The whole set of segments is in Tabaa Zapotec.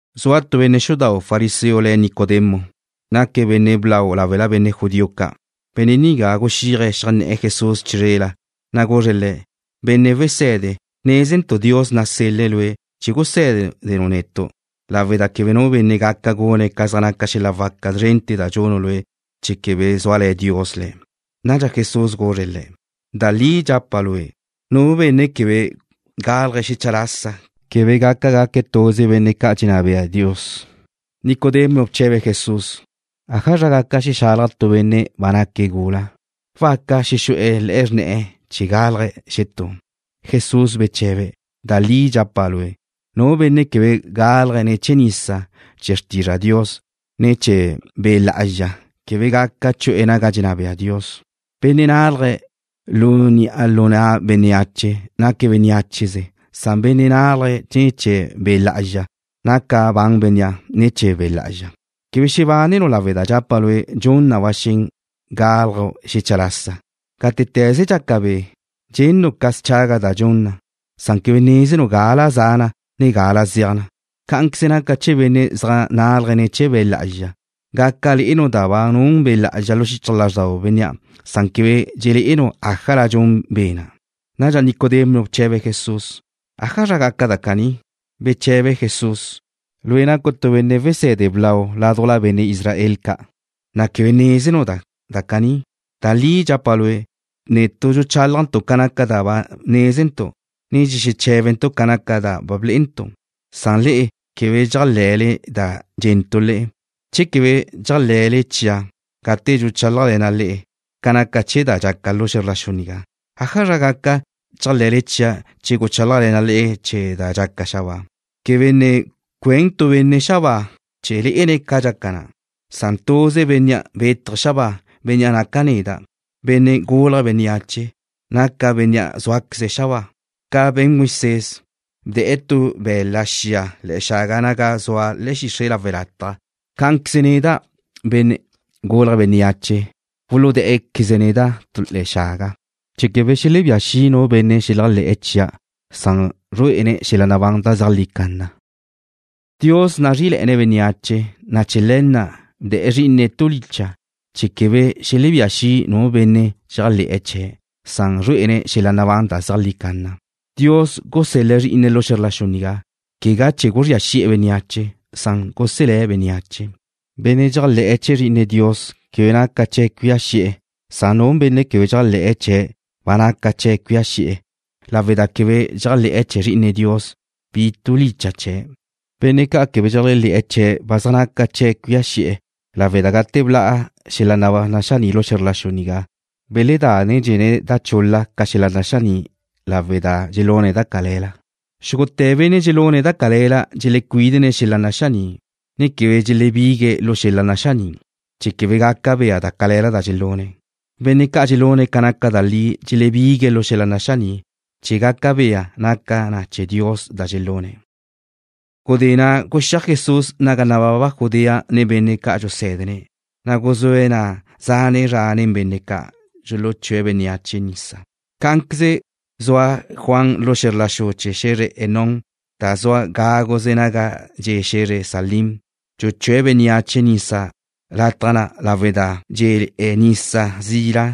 Zua tu benne' xudau' fariseo le̱' Nicodemo. Naque̱' benne' blau láwela benne' judío ca'. Benne' nigá guxíaje̱' xeajnné̱'e̱ Jesús chizrela, na' guzre̱' Le̱': ―Benne' Wese̱de, nézentu' Dios nasel-le̱' Lue' chee̱ gusé̱denu' netu' lawe' da quebe nu benne' gaca gune̱' ca zaj naca xel-la' waca zrente̱ da dxunu' Lue' che quebe zúale̱ Dios le̱'. Nadxa Jesús guzre̱' le̱': ―Da li dxapa' lue', nu benne' quebe gálaje̱' xecha lasa quebe gaca gaque̱' tuze benne' ca' dxenná be'e Dios. Nicodemo bche̱be̱' Jesús: ―¿Ájazra gaca xexalaj tu benne' ba naque̱' gula? ¿Waca xexu'e̱ le̱'e xrne̱'e̱ chee̱ gálaje̱' xetú? Jesús beche̱be̱': ―Da li dxapa' lue', nu benne' quebe gálaje̱' ne̱ chee̱ nisa chee̱ xrtizra' Dios, ne ne̱ chee̱ Be' Lá'azxa, quebe gaca chu'e̱ naga dxenná bea Dios. Benne' nálaje̱' lu ni'a lu na' bénneache, naque̱' bénneacheze. Nu benne' nálaje̱' ne̱ chee̱ Be' Lá'azxa, naca ban bénnea' ne̱ chee̱ Be' Lá'azxa. Quebe xebánenu' lawe' da dxapa' lue', dxun na ba xen gálaju' xecha lasa. Gátete̱ze dxaca be'. Dxennu' ca schaga da dxun na, na' quebe nézenu' gala za na, ne gala zeaj na. Cá'anqueze naca chee̱ benne' zaj nálaje̱' ne̱ chee̱ Be' Lá'azxa. Gaca le'enu' da ba nun Be' na' lu xichaj lázxdau bénnea', na' quebe dxelé'enu' ájala dxun Be' na'. Nadxa Nicodemo bche̱be̱' Jesús: ―¿Ájazra gaca da caní? Beche̱be Jesús: ―Lue' nacu' tu benne' wesé̱de blau ládujla benne' Israel ca', na' ¿quebe nézenu' da caní? Da li dxapa' lue', netu' dxuchálajntu' ca naca da nézentu', ne dxexeché̱bentu' ca da blé'entu', na' le'e quebe dxéajle̱le da dxe̱ntu' le'e. Che quebe dxéajle̱le chia' gate dxuchálajle̱na' le'e ca naca chee̱ da dxaca lu xe̱zr la xu nigá, ¿ájazra gaca chéajle̱le chia' che guchálajle̱na' le'e chee̱ da dxaca xabáa? ’Quebe ne cuen tu benne' xabáa chee̱ lé'ene̱' ca dxaca na'. Tuze Bénnea' bétaje̱' xabáa, Bénnea' naca' neda', Benne' Gulje̱' Bénneache, naca' Bénnea' zúaqueze̱' xabáa. Ca be̱n Moisés, bde̱'e̱ tu be̱la' xia le̱'e̱ xaga naga zua le̱'e̱ xixre' lawe' lataj, cá'anqueze neda', Benne' Gulje̱' Bénneache, wuludá'queze̱' neda' tu le̱'e̱ xaga, chee̱ quebe xelebía xi' nu benne' xeléajle̱'e̱ chia'. Zrué'e bénnea' xel-la' nabán da zeajlí canna. Dios dxezrí'i lázrele̱'e̱ne̱' bénneache, na' chee̱ le̱ na' bdee̱' Zrí'ine̱' tu licha' chee̱ quebe xelebía xi' nu benne' dxeléajle̱'e̱ chee̱'. Zrué'e bénnea' xel-la' nabán da zeajlí canna. Dios gusél-le̱' Zrí'ine̱' lu xe̱zr la xu nigá, quegá chee̱ guzría xi'e̱ bénneache, san chee̱ guselé̱' bénneache. Bénnea' dxéajle̱'e̱ chee̱ Zri'ine Dios quebe naca chee̱' cuía xi'e̱, san nu benne' quebe dxéajle̱'e̱ chee̱' ba naca chee̱' cuía xi'e̱ lawe' da quebe dxéajle̱'e̱ chee̱ Zri'ine Dios, bi tu licha' chee̱'. Benne' ca' quebe dxeléajle̱'e̱ chee̱' ba zaj naca chee̱' cuía xi'e̱ lawe' da gate bla' xel-la' naxaní' lu xe̱zr la xu nigá, beledánedxene̱' da chul-la ca xel-la' naxaní', lawe' da dxelune̱' da cale̱la. Xúgute̱ benne' dxelune̱' da cale̱la dxelecuídene̱' xel-la' naxaní', ne quebe dxelebigue̱' lu xel-la' naxaní', chee̱ quebe gaca bea da cale̱la da dxelune̱'. Benne' ca' dxelune̱' ca naca da li dxelebigue̱' lu xel-la' naxaní' chee̱ gaca bea naca na chee̱ Dios da dxelune̱'. Gudé na' guxíaj Jesús naga nababa Judea nen benne' ca' dxusé̱dene̱', na' guzúe̱' na' zane' zra nen benne' ca', dxuluchúe̱' bénneache nisa. Cá'anqueze zua Juan lu xe̱zr la xu chee̱ xe̱zre Enón da zua gáguze naga dxe' xe̱zre Salím, dxuchúe̱' bénneache nisa lataj na' lawe' da dé̱le̱'e̱ na' nisa zila,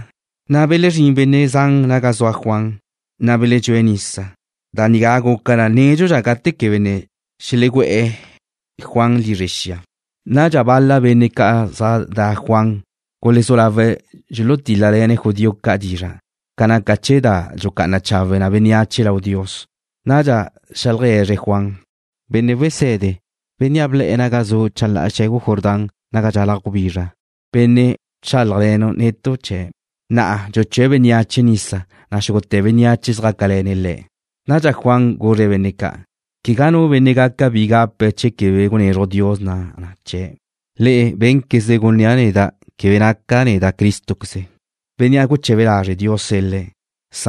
na' belezrín benne' zan naga zua Juan, na' beledxúe̱' nisa. Da nigá guca na nédxudxa gate quebe ne xelegú'e̱ Juan lizre xia. Nadxa bal-la benne' zaj de̱'e̱ Juan gulezú lawe̱' dxulutil-le̱' judío ca' dizra' ca naca chee̱ da dxucá'ana chawe na bénneache lau Dios. Nadxa xeajlegue̱zre̱' Juan: ―Benne' wese̱de, bénnea' ble̱'e̱ naga zu' chalá'a xe̱gu Jordán naga dxalaj gubizra, bénnea' bchálajle̱nu' netu' chee̱', na'a dxuchúe̱' bénneache nisa, na' xúgute̱ bénneache zjácale̱ne̱' Le̱'. Nadxa Juan guzre̱' benne' ca': ―Quegá nu benne' gaca bi gape̱' che quebe gunezruj Dios na chee̱'. Le'e bénquezle gunnía' neda' quebe nácaqueza' neda' Cristo, Bénnea' guche̱be lazre' Dios sel-le̱'.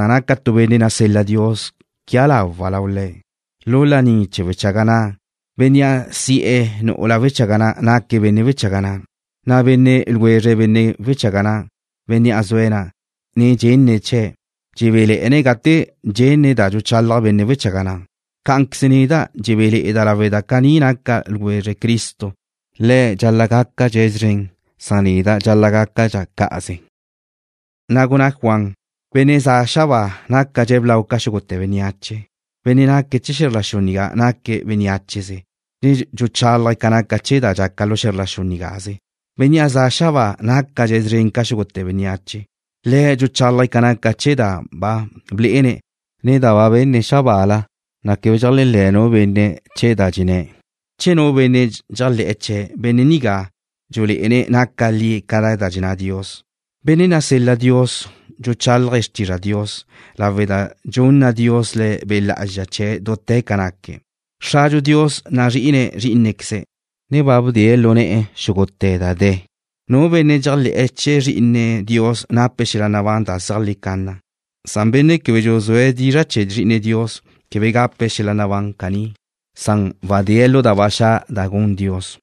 Naca' tu benne' nasel-la Dios chee̱ quia lawa' lau Le̱'. Lu laní chee̱ wechaga na', bénnea' si'e̱ nu'ula wechaga na' naque̱' benne' wechaga na', na' benne' ljwezre benne' wechaga na', bénnea' zue̱' na', ne dxenne̱' chee̱', dxebéle̱'e̱ne̱' gate dxenne̱' da dxuchalaj benne' wechaga na'. Cá'anqueze neda' dxebéle̱'e̱da' lawe' da caní naca' ljwezre Cristo. Le̱' dxal-la' gácadxe̱' szren, na' neda' dxal-la' gácadxa' cá'aze. Na' gunná Juan: ―Bénnea' za' xabáa nácadxe̱' blau ca xúgute̱ bénneache. Benne' naque̱' chee̱ xe̱zr la xu nigá naque̱' bénneacheze, ne dxuchálaje̱' ca naca chee̱ da dxaca lu xe̱zr la xu nigáze. Bénnea' ze̱'e̱ xabáa nácadxe̱' szren ca xúgute̱ bénneache. Le̱' dxuchálaje̱' ca naca chee̱ da ba blé'ene̱', ne da ba benne̱' xabaala, na' quebe dxéajle̱' nu benne' chee̱ da dxenné̱'. Che nu benne' dxéajle̱'e̱ chee̱', benne' nigá dxulé'ene̱' naca li ca da dxenná Dios. Bénnea' nasel-la Dios dxuchálaje̱' xrtizra' Dios lawe' da dxunna Dios Le̱' Be' Lá'azxa chee̱' dute̱ ca naque̱'. Xradxu Dios nazrí'ine̱' Zrí'inequeze̱', ne ba bdee̱' lu ne̱'e̱ xúgute̱ da de̱. Nu benne' dxéajle̱'e̱ chee̱ Zri'ine Dios nape̱' xel-la' nabán da zeajlí canna, na' benne' quebe dxuzúe̱' dizra' chee̱ Zri'ine Dios quebe gape̱' xel-la' nabán caní. Wadée̱' lu da ba xa' da gun Dios.